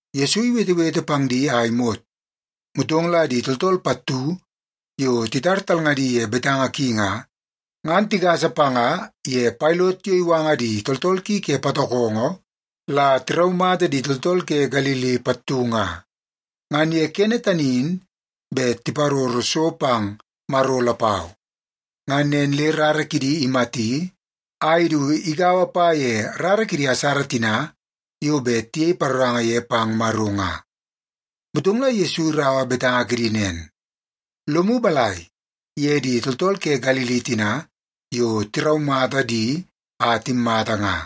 Yesu iwetewete pang di a imot, motong la di tooltool pattu yo titar talngadi ye betanga ki nga, ngan tigasa panga ye Pailot yo iwanga di tooltool ki ke patokongo la tiraumata di tooltool ke Galili pattu nga. Ngan ye kene tani in bet tiparoro so pang Maro lapau. Ngan nen le rara kidi imati a idu igaua pa ye rara kidi asara tina yo bet tiyei paroranga ye pang Maro nga. Motong la Yesu iraua betanga kidi nen, “Lomu balai ye di tooltool ke Galili tina yo tiraumata di a timmata nga,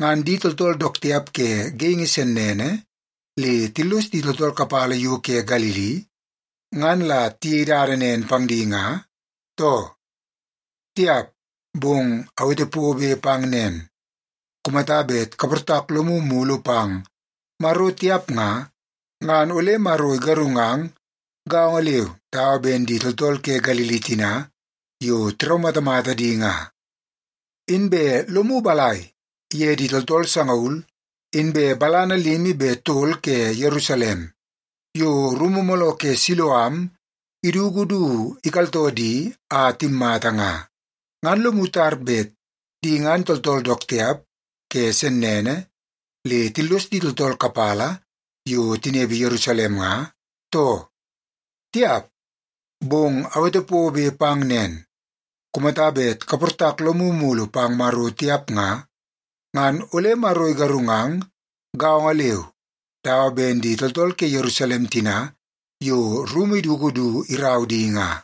ngan di tooltool dook tiap ke geingi sennene le tillos di tooltool kapala yo ke Galili, ngan la tiyei dada nen pang di nga, too? Tiap! Bong awete pobe pang nen, kumata bet kaportak lomu mulu pang Maro tiap nga, ngan ole Maro igarungang gaongo leu dawa ben di tooltool ke Galili tina yo tiraumatamata di nga. Inbe lomu balai ye di tooltool sangaul inbe balana limi be tol ke Yerusalem yo rumu mooloo ke Siloam iduku du ikaltoo di a timmata nga? Ngan lomu tar bet di ngan tooltool dook tiap ke sennene le tillos di tooltool kapala yo tinepe Yerusalem nga, too? Tiap! Bong awete pobe pang nen, kumata bet kaportak lomu mulu pang Maro tiap nga, ngan ole Maro igarungang gaongo leu dawa ben di tooltool ke Yerusalem tina yo rumu iduku du irau di nga.”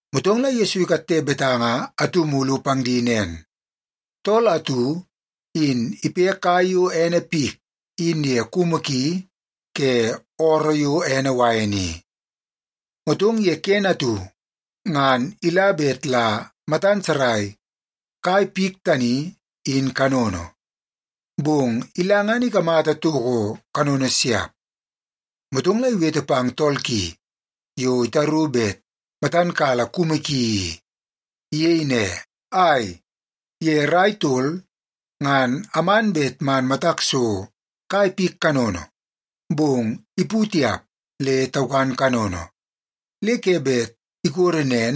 Motong la Yesu ikatte betanga atu mulu pang di nen, “Tool atu in ipe kai yo ene pik in ye kumu ki ke ooroo yo ene wain i. Motong ye kene atu ngan ila bet la matan sarai kai pik tani in kanono, bong ila ngan ikamata toko kanono siap. Motong la iwete pang tool ki yo itaru bet matan kala kumu ki i. Iyei ne, ‘Ai, ye rai tol ngan aman bet man matak so kai pik kanono, bong ipu tiap, le taukan kanono. Le ke bet ikodo nen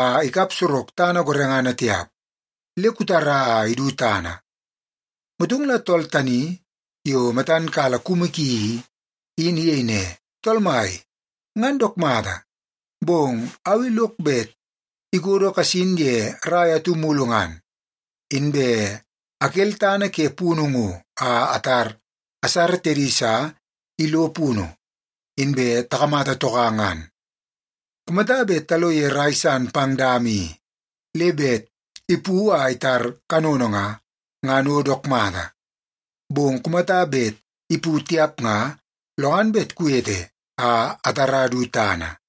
a ikap sorok tana gorengana tiap. Le kutara a idu tana.’ “Motong la tool tani yo matan kala kumu ki i, in iyei ne, ‘Tool mai, ngan dook mata, bong au i lok bet ikodo kasin ye rai atu mulu ngan, inbe akel tana ke punu ngo a atar asara tedi sa ilo punu, inbe takamata toka ngan. Kumata bet talo ye rai san pang dama i, le bet ipu a itar kanono nga, ngan o dook mata. Bong kumata bet ipu tiap nga, lo ngan bet kuwete a atara du tana.’”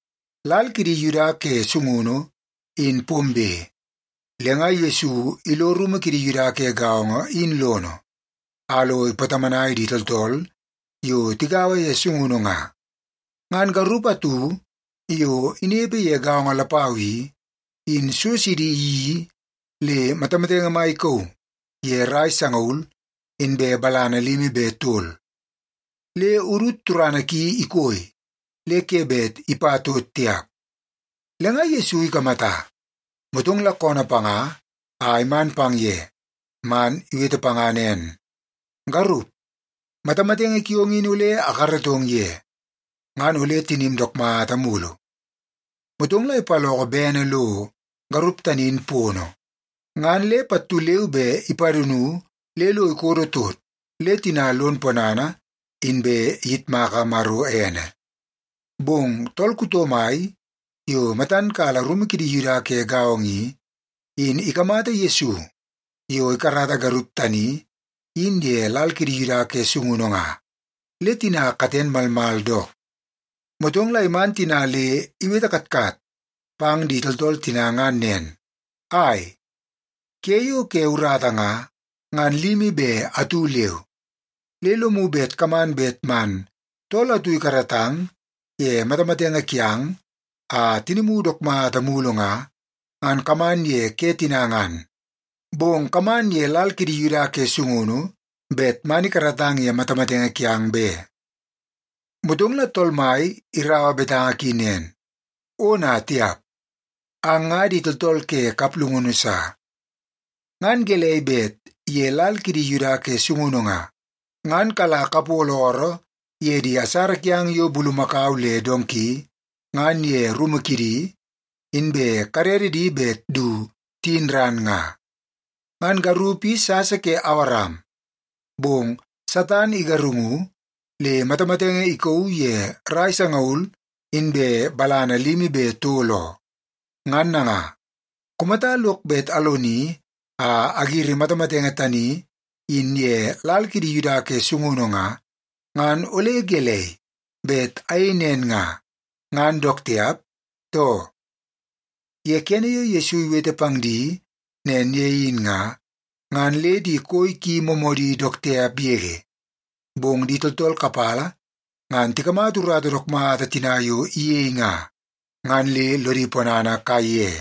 Lal kidi Yuda ke sungunu in pombe, le nga Yesu ilo rumu kidi Yuda ke gaongo in lono a lo ipatomonai di tooltool yo tigaua ye sungunu nga. Ngan garup atu yo inepe ye gaongo lapau i, in so sidi iyeii le matamatenge mai ikauu ye rai sangaul inbe balana limi be tol. Le udut turana ki ikoi le ke bet ipa tot tiap. Le nga Yesu ikamata, motong la koonoo panga a iman pang ye, man iwete panga nen, “Garup, matamatenge kiong in ole akaratong ye, ngan ole tinim dook mata mulu.” Motong la ipaloko bene lo garup tani in pono, ngan le pattu leu be ipadunu le lo ikodo tot le tina lon ponana, inbe iyitmaka Maro ene. Bong tool kuto mai yo matan kala rumu kidi Yuda ke gaongo i, in ikamata Yesu yo ikarata garup tani in ye lal kidi Yuda ke sungunu nga, le tina katen malmal dook. Motong la iman tina le iwete katkat pang di tooltool tina ngan nen, “Ai, ke yo ke urata nga, ngan limi be atu leu. Le lomu bet kaman bet man tool atu ikaratang ye matamatenge kiang a tinimu dook mata mulu nga, ngan kaman ye ke tina ngan. Bong kaman ye lal kidi Yuda ke sungunu bet man ikaratang ye matamatenge kiang be.” Motong la Tool Mai iraua betanga ki nen, “Ona tiap! Ang nga di tooltool ke kaplungunu sa. Ngan gelei bet ye lal kidi Yuda ke sungunu nga, ngan kala kapolo ooroo ye di asara kiang yo bulumakau le donki ngan ye rumu kidi, inbe kadede di bet du tiyin ran nga? Ngan garup i sasa ke Awaram, bong Satan igarungu le matamatenge ikauu ye rai sangaul inbe balana limi be tol oo. Ngan nanga, kumata lok bet aloni a agiri matamatenge tani in ye lal kidi Yuda ke sungunu nga, ngan ole gelei, bet ayei nen nga, ngan dook tiap, too?” Ye kene yo Yesu iwete pang di nen ye in nga, ngan le di koi ki moomoodi dook tiap yege. Bong di tooltool kapala ngan tikamata urata dook mata tina yo iyei nga, ngan le lodi ponana kaiye.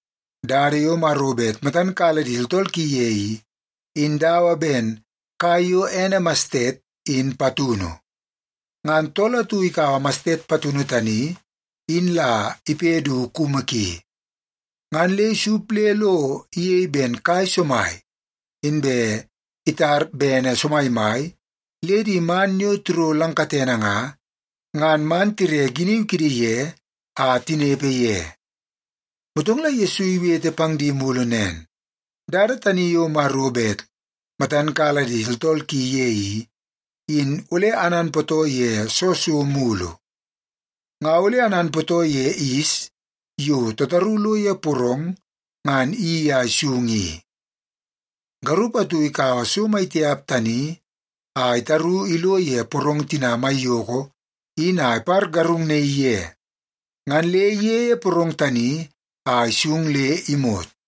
Dada yo Maro bet matan kala di tooltool ki ye i, in dawa ben kai yo ene mastet, in patunu. Ngan tool atu ikaua mastet patunu tani in la ipe du kumu ki, ngan le isup le lo iyei ben kai somai. Inbe itar bene somaimai le di man yo tiro lang katene nga, ngan man tire giniu kidi ye a tinepe ye.” Motong la Yesu iwete pang di mulu nen, “Dada tani yo Maro bet matan kala di tooltool ki ye i, in ole ananpootoo ye soo so mulu? Nga ole ananpootoo ye yis yo tataru lo ye porong ngan iyeii a isung i. Garup atu ikaua so mai tiap tani a itaru ilo ye porong tina maiyoko in a ipargarungnaii ye, ngan le iyeie porong tani a isung le imot.”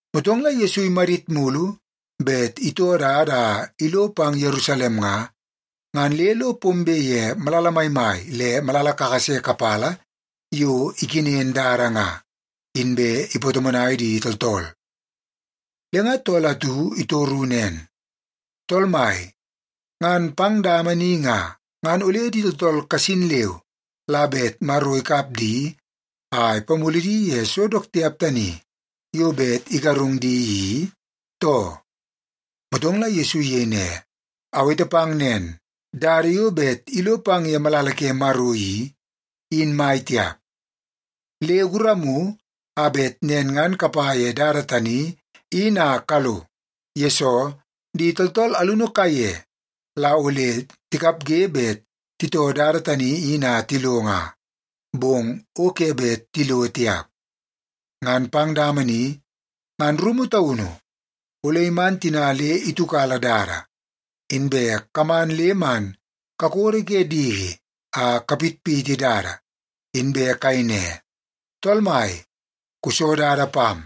Motong la Yesu imadit mulu bet itoo dada a ilo pang Yerusalem nga, ngan le lo pombe ye malala maimai le malala kakase kapala yo ikenen dada nga, inbe ipatomonai di tooltool. Le nga tool atu itoru nen, “Tool Mai, ngan pang dama ni nga, ngan ole di tooltool kasin leu la bet Maro ikap di a ipamulu di ye so dook tiap tani yo bet igarung di i, too?” Motong la Yesu iyei ne, “Awete pang nen, dada yo bet ilo pang ye malala ke Maro i, in mai tiap. Le guramu a bet nen ngan kapa ye dada tani in a kalo. Yesoo, di tooltool alunu kaiye la ole tikapge bet titoo dada tani in a tilo nga, bong o ke bet tilo tiap. Ngan pang dama ni ngan rumu taunu ole iman tina le itiukala dada, inbe kaman le man kakodo ke diki a kapitpiti dada, inbe kayei ne, ‘Tool Mai, kuso dada pam.’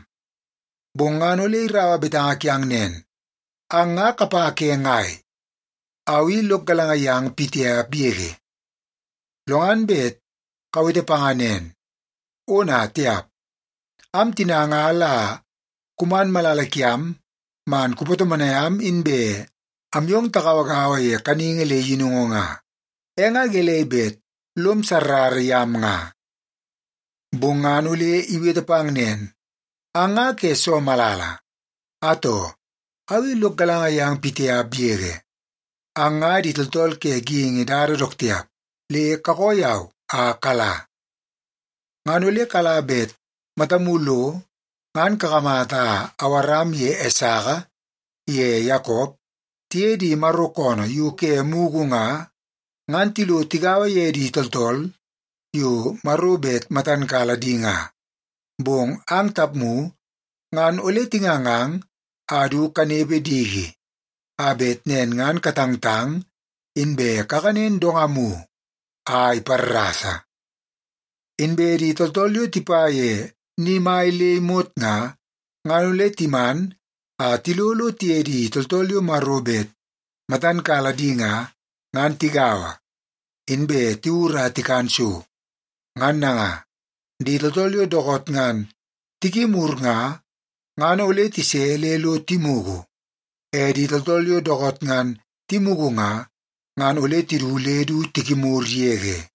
“Bong ngan ole iraua betanga kiang nen, ‘Ang nga kapa ke ngai? Au i lok galanga yang pitiap yege.’ “Lo ngan bet kawete panga nen, ‘Ona tiap! Am tina nga la kuman malala kiam man kupatomonai am inbe am yong tagauagaua ye kaningi le yinungu nga, e nga gelei bet lom sarrara yam nga?’ “Bong ngan ole iwete pang nen, ‘Ang nga ke soo malala? Atoo, au i lok galanga yang pitiap yege. Ang nga di tooltool ke geingi dada dook tiap, le kakoo yau a kala!’ “Ngan ole kala bet matamu lo ngan kakamata Awaram ye Esaka ye Yakop tiye di Maro koonoo yo ke mugu nga, ngan tilo tigaua di tooltool yo Maro bet matan kala di nga. Bong ang tapmu ngan ole tingangang a du kanepe diki, a bet nen ngan katangtang, inbe kakanen dongamu a iparrasa. Inbe di tooltool yo tipa ye ni mai le imot nga, ngan ole timan a tilo lo tiye di tooltool yo Maro bet matan kala di nga, ngan tigaua, inbe tiwur a tikan so. Ngan nanga, di tooltool yo dookoot ngan tikimur nga, ngan ole tise le lo timugu. E di tooltool yo dookoot ngan timugu nga, ngan ole tidu le du tikimur yege.”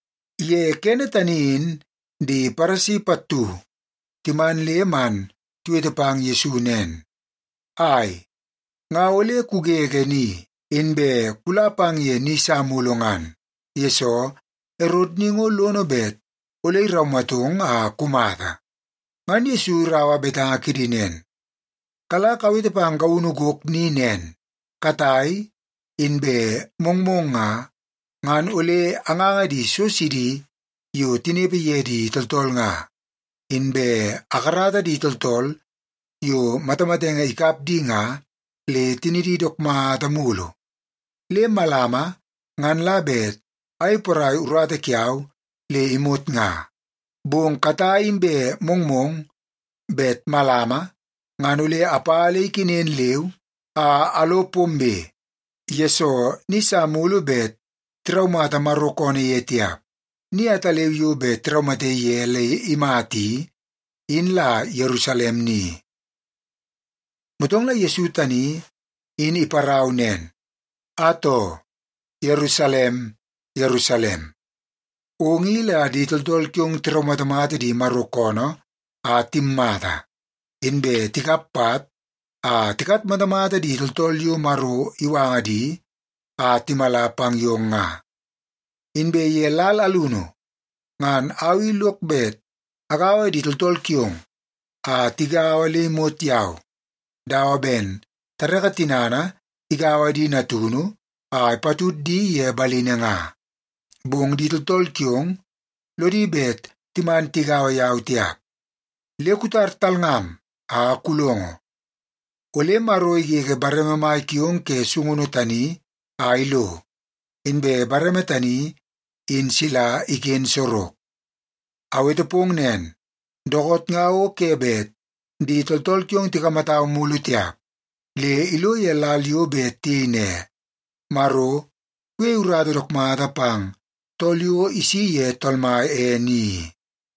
Ye kene tani in di Paresi pattu timan le man tiwete pang Yesu nen, “Ai, nga ole kugege ni, inbe kula pang ye ni sa mulu ngan, yesoo Erot ni ngo lono bet ole iraumatong a kumata.” Ngan Yesu iraua betanga kidi nen, “Kala kawete pang gaunu gok ni nen, ‘Katai inbe mongmong nga, ngan ole anganga di so sidi yo tinepe ye di tooltool nga, inbe akarata di tooltool yo matamatenge ikap di nga, le tinidi dook mata mulu. Le malama ngan la bet ayei porai urata kiau le imot nga.’ Bong katai inbe mongmong bet malama ngan ole apa le ikenen leu a alo pombe, yesoo ni sa mulu bet tiraumata Maro koonoo ye tiap. Ni ataleu yo bet tiraumate ye le imata i, in la Yerusalem ni.” Motong la Yesu tani in iparau nen, “Atoo, Yerusalem, Yerusalem, ong i la di tooltool kiong tiraumatamata di Maro koonoo a timmata, inbe tikap pat a tikatmatamata di tooltool yo Maro iwanga di a timala pang yong nga. Inbe ye lal alunu ngan au i lok bet agaua di tooltool kiong a tigaua le imot yau, dawa ben tareke tinana igaua di natunu a ipatud di ye balini nga. Bong di tooltool kiong lodi bet timan tigaua yau tiap. Le kutar talngam a kulongo, ole Maro igege bareme mai kiong ke sungunu tani a ilo, inbe bareme tani in sila iken sorok. Awete pong nen, dookoot nga o ke bet di tooltool kiong tikamatau mulu tiap, le ilo ye lal yo bet tiyei ne, ‘Maro kuyeie urata dook mata pang tool yo isi ye Tool Mai ene i.’”